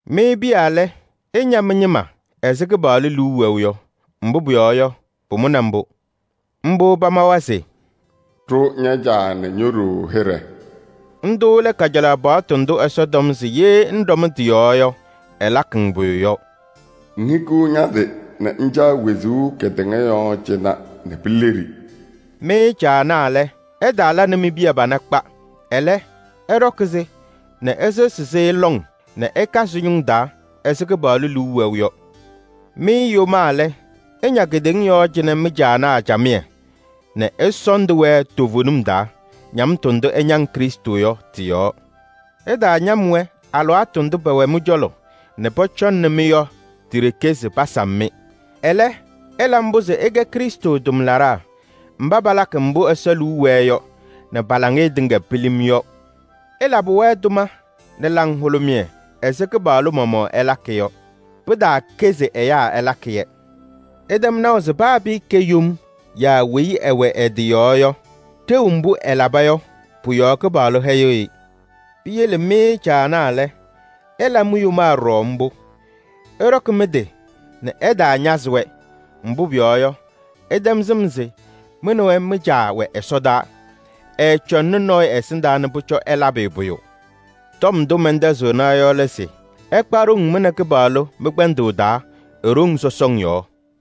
Mɩ piya lɛ, ɩña mɩ-ñɩma ɛzɩ Kɩpaɣlʋ liu wɛʋ yɔ. Mbʋ pʋyɔɔ yɔ, pʋmʋnɩ mbʋ. Mbʋ pamawa se: “Ɖʋ ña-caa nɛ ño-ɖoo hɩɖɛ.” Ndʋ lɛ kajalaɣ paɣtʋ ndʋ Ɛsɔ tɔm se ye ŋɖɔm tɩ-yɔɔ yɔ, ɛlakɩ-ŋ pʋyʋ yɔ: “Ŋhikiɣ ña-tɩ nɛ ŋcaɣ wezuu kedeŋa yɔɔ cɩnɛ nɛ pileɖi.” Mɩ caanaa lɛ, ɩtaala nɛ mi-piya pana kpa. Ɛlɛ, ɩɖɔkɩ-sɩ nɛ ɩsɩɣzɩ-sɩ lɔŋ nɛ ɩka sɩ-ñʋŋ taa ɛzɩ Kɩpaɣlʋ liu wɛʋ yɔ. Mɩ yomaa lɛ, ɩña kedeŋa yɔɔ cɩnɛ mɩ-caanaa camɩyɛ nɛ ɩsɔɔndɩ-wɛ toovenim taa, ñamtʋ ndʋ ɩñaŋ Krɩstʋ yɔ tɩ-yɔɔ. Ɩtaañam-wɛ alɩwaatʋ ndʋ pɛwɛ mɩ-cɔlɔ nɛ pɔcɔŋnɩ-mɩ yɔ ti-ɖeke se pasam-mɩ. Ɛlɛ, ɩla mbʋ se ɩkɛ Krɩstʋ tʋmlaɖaa mba palakɩ mbʋ Ɛsɔ liu wɛɛ yɔ nɛ pa-laŋɩyɛ tɩŋa pilim yɔ. Ɩlabɩ-wɛ tʋma nɛ laŋhʋlʋmɩyɛ ɛzɩ Kɩpaɣlʋ maɣmaɣ ɩlakɩ yɔ. Pɩtaakɛ se ɛyaa ɩlakɩ-yɛ. Ɩtɛm naʋ se paa pɩɩkɛ yom yaa weyi ɛwɛ ɛ-tɩ yɔɔ yɔ, ɖeu mbʋ ɛlaba yɔ, pʋ-yɔɔ Kɩpaɣlʋ hɛyɩɣ-ɩ. Piyele mɩ caanaa lɛ, ɩla mi-yomaa ɖɔɖɔ mbʋ. Ɩɖɔkɩ mɩ-tɩ nɛ ɩtaañazɩ-wɛ. Mbʋ pʋyɔɔ yɔ, ɩtɛm sɩm se mɩ nɛ wɛ mɩ-Caa wɛ ɛsɔdaa. Ɛɛcɔŋnɩ nɔɔyʋ ɛsɩndaa nɛ pʋcɔ ɛlabɩ-ɩ pʋyʋ. Tɔm ndʋ mɛntɛzɩɣna yɔ lɛ se: ɩkpa ɖoŋ mɩ nɛ Kɩpaɣlʋ mɩ-kpɛndʋʋ taa e-ɖoŋ sɔsɔŋ yɔɔ.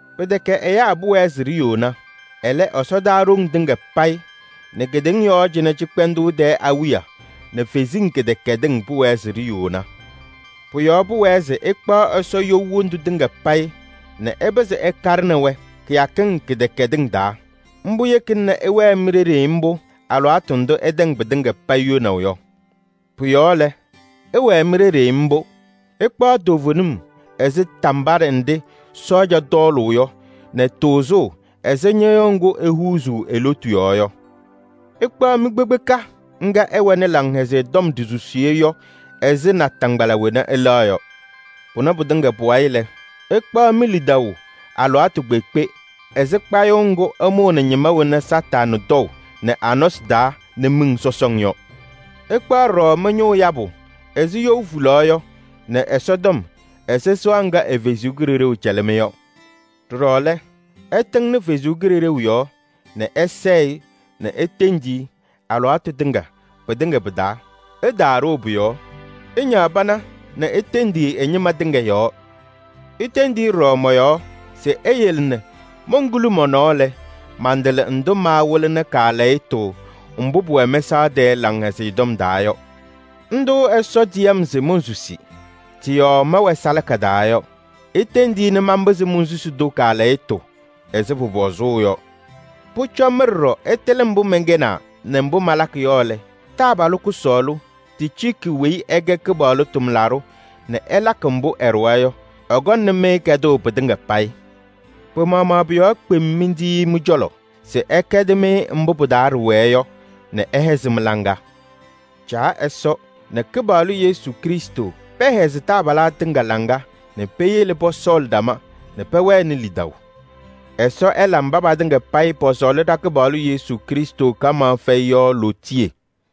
Pɩtɛkɛ ɖa nɛ ɛyaa ɖiyouna. Ɛlɛ, ɖa nɛ ɛsɔdaa ɖoŋ tɩŋa payɩ nɛ kedeŋa yɔɔ cɩnɛ cɩkpɛndʋʋ tɛɛ awiya nɛ ɛsɔdaa kalɩzasɩ kɩdɛkɛdɩsɩ ɖiyouna. Pʋ-yɔɔ pʋwɛɛ se ɩkpaɣ Ɛsɔ you wondu tɩŋa payɩ nɛ ɩpɩzɩ ɩkaɖɩnɩ-wɛ kɩyakɩŋ kɩdɛkɛdɩŋ taa. Mbʋ yekina nɛ ɩwɛɛ mi-ɖeɖe mbʋ alɩwaatʋ ndʋ ɩtɛŋ patɩŋa payɩ yonaʋ yɔ. Pʋ-yɔɔ lɛ, ɩwɛɛ mi-ɖeɖe mbʋ: ɩkpaɣ toovenim ɛzɩ tambaɖɛ nɖɩ sɔɔja tɔɔlʋʋ yɔ nɛ tʋʋzʋʋ ɛzɩ ñɩɣyʋʋ ŋgʋ ehuuzuu e-lotu yɔɔ yɔ. Ɩkpaɣ mi-kpekpeka ŋga ɩwɛnɩ Laŋhɛzɩyɛ Tɔm ɖisusiye yɔ ɛzɩ nataŋgbala wena ɩlɛɣ yɔ. Pʋnɛ pɩtɩŋa pʋ-wayɩ lɛ, ɩkpaɣ mi-lidaʋ alɩwaatʋ kpeekpe ɛzɩ kpayʋʋ ŋgʋ ɩmʋʋnɩ ñɩma wena Kañadʋ Satanɩ tɔʋ nɛ a-nɔsɩ taa nɛ miɖeɖeŋ yɔ. Ɩkpaɣ ɖɔɖɔ mɩ-ñʋʋ yabʋ ɛzɩ you hulaɣ yɔ nɛ Ɛsɔtɔm ɛzɩ you sɩɣa ŋga ɛ-Kalɩzaɣ cɛlɩ-mɩ yɔ. Ɖɔɖɔ lɛ, ɩtɩŋnɩ Ɛsɔ Kalɩzaɣ yɔɔ nɛ ɩsɛɛ-ɩ nɛ itendi-i alɩwaatʋ tɩŋa pɩtɩŋa pɩ-taa. Ɩtaaɖoo pʋ-yɔɔ, ɩñaɣ pana nɛ itendi-i ɛ-ñɩma tɩŋa yɔɔ. Itendi-i ɖɔɖɔ mɔ-yɔɔ se eyele nɛ monkuli mɔ-nɔɔ lɛ, mantɩlɩ ndʋ maawɩlɩnɩ kaalɛyɩtʋ mbʋ pʋwɛ mɛsaɣ tɛɛ Laŋhɛzɩyɛ Tɔm taa yɔ. Ndʋ Ɛsɔ tiyi-m se monsusi, tɩ-yɔɔ mɛwɛ salaka taa yɔ. Itendi-i nɛ manpɩzɩ monsusi-tʋ kaalɛyɩtʋ ɛzɩ pʋpɔzʋʋ yɔ. Pʋcɔ mɩ ɖɔɖɔ ɩtɩlɩ mbʋ mɛnkɛnaa nɛ mbʋ malakɩ yɔ lɛ, taabalʋ kʋsɔɔlʋ Ticiiki weyi ɛkɛ Kɩpaɣlʋ tʋmlaɖʋ nɛ ɛlakɩ mbʋ ɛɖʋwa yɔ, ɛkɔŋnɩ-mɩ kɛdʋʋ pɩtɩŋa payɩ. Pɩ-maɣmaɣ pʋ-yɔɔ kpem mentiyi-i mɩ-cɔlɔ se ɛkɛdɩ-mɩ mbʋ pɩ-taa ɖɩwɛɛ yɔ nɛ ɛhɛzɩ mɩ-laŋa. Caa Ɛsɔ nɛ Kɩpaɣlʋ Yesu Krɩstʋ pɛhɛzɩ taabalaa tɩŋa laŋa nɛ peyele pɔsɔɔlɩ ɖama nɛ pɛwɛnɩ lidaʋ. Ɛsɔ ɛla mba patɩŋa payɩ pɔsɔɔlɩ ɖa-Kɩpaɣlʋ Yesu Krɩstʋ kamaɣ fɛyɩ yɔ lootiye!